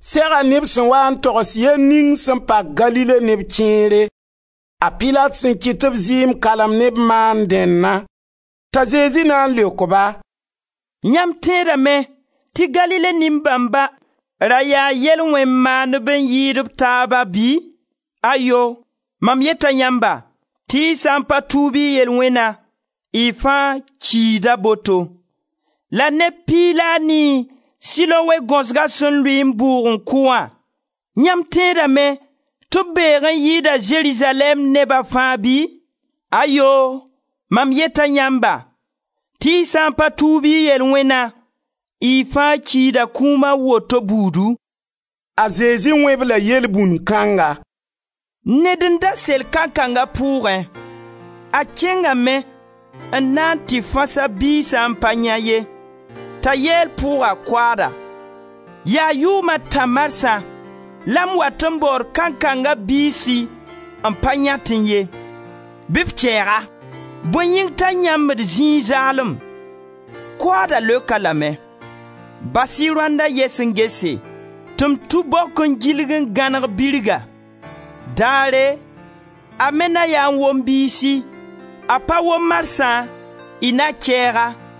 Sega neb sẽn wa n togs yell ning sẽn pak Galile neb kẽere, a Pilat sẽn kɩt tɩ b zɩɩm kalm ne b maand dẽnna. T'a Zezi na n leok ba: «Yãmb tẽedame tɩ Galile nin-bãmba ra yaa yel-wẽn-maandb n yɩɩd b taaba bɩ? Ayoo! Mam yeta yãmba tɩ y sã n pa tuub y yel-wẽna, y fãa kida boto. La neb piig la a nii Siloe gaosga sẽn lʋɩ n bʋʋg n kʋ wã, yãmb tẽedame tɩ b beeg n yɩɩda Zerizalɛɛm neba fãa bɩ? Ayoo! Mam yeta yãmba tɩ y sã n pa tuub y yel-wẽna y fãa kiida kũum a woto buudu.» A Zezi wẽ-b la yelbũnd kãnga: «Ned n da sel kankang a pʋʋgẽ. A kẽngame n na n tɩ fãs a biis n pa yãe ye. T'a yeel pʋʋga koaada: ‹Yaa yʋʋm a tã marsã la m wat n baood kankanga biisi n pa yãetẽ ye. Bɩ f kɛɛg-a! Bõe yĩng t'a yãmbd zĩig zaalem?› Koaada leok-a lame: ‹Bas-y rõandã yɛs n gese, tɩ m tũ bok n gilg n gãneg birga. Daare a me na yaa n wom biisi; a pa wom marsã, y na kɛɛg-a.›»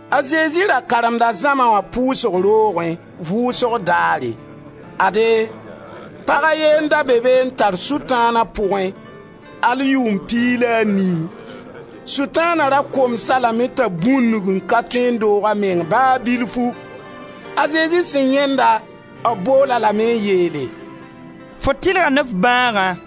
A Zezi ra karemda zãma wã pʋʋsg roogẽ, vʋʋsg daare. Ade, pag a ye n da be be n tar Sʋtãan a pʋgẽ, al yʋʋm piig la a nii. Sʋtãana ra koms-a lame t'a bũndg n ka tõe n doog a meng ba bilfu. A Zezi sẽn yãend-a, b bool-a lame n yeele: «Fo tɩlga ne f bãagã.»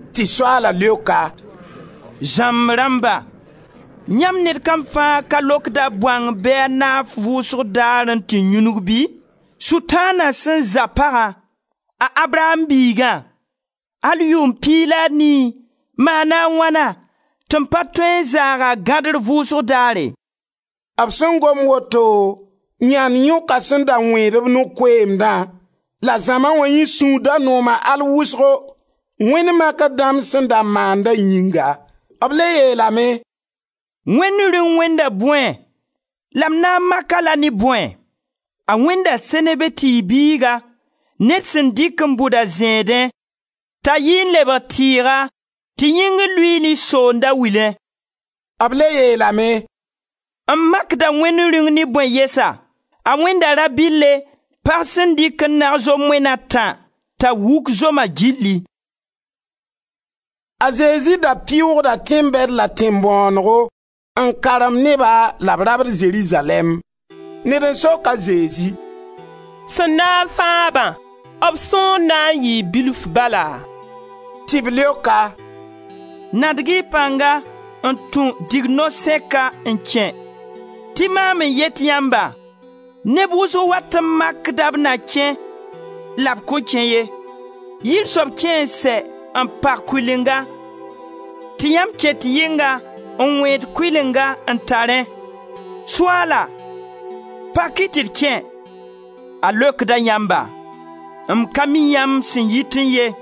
Tɩ Soaala leok-a: «Zãmb rãmba, yãmb ned kam fãa ka lokd a bõang bɩ a naf vʋʋsg daar n tɩ yũnug bɩ? Sʋtãana sẽn za pagã, a Abraam biigã, al yʋʋm piig la a nii, maana a wãna tɩ m pa tõe n zaag a gadr vʋʋsg daare?» B sẽn gom woto, yãnd yõka sẽn da wẽed-b no-koeemdã, la zãma wã yẽ sũur da nooma al wʋsgo, Wẽnd makr dãmb sẽn da maanda yĩnga. B le yeelame: «Wẽnd Rĩung wẽnda bõe, la m na n mak-a-la ne bõe? A wẽnda seneve tɩɩg biiga ned sẽn dɩk n bʋd a zẽedẽ, t'a yi n lebg tɩɩga tɩ yĩngr luiili soond a wilẽ.» B le yeelame: «M makda Wẽnd Rĩung ne bõe yɛsa? A wẽnda rabɩlle pag sẽn dɩk n nag zom moen a tã, t'a wuk zoma gilli.» A Zezi da pɩʋʋgda tẽn-bɛd la tẽn-bõonego n karemd neba la b rabd Zerizalɛɛm. Ned n sok a Zezi: «Sẽn na n fãag-bã, b sõor na n yɩɩ bilf bala?» Tɩ b leok-a: «Nadg-y pãnga n tũ digno-sẽka n kẽ. Tɩ maam n yet yãmba, neb wʋsg wat n makda b na kẽ la b kõn kẽ ye. Yir soab kẽ n sɛ n pag kʋɩlenga tɩ yãmb ket yɩnga n wẽed kʋɩlenga n tarẽ: ‹Soaala! Pak-y tɩ d kẽ!› A leokda yãmba: ‹M ka mi yãmb sẽn yitẽ ye!›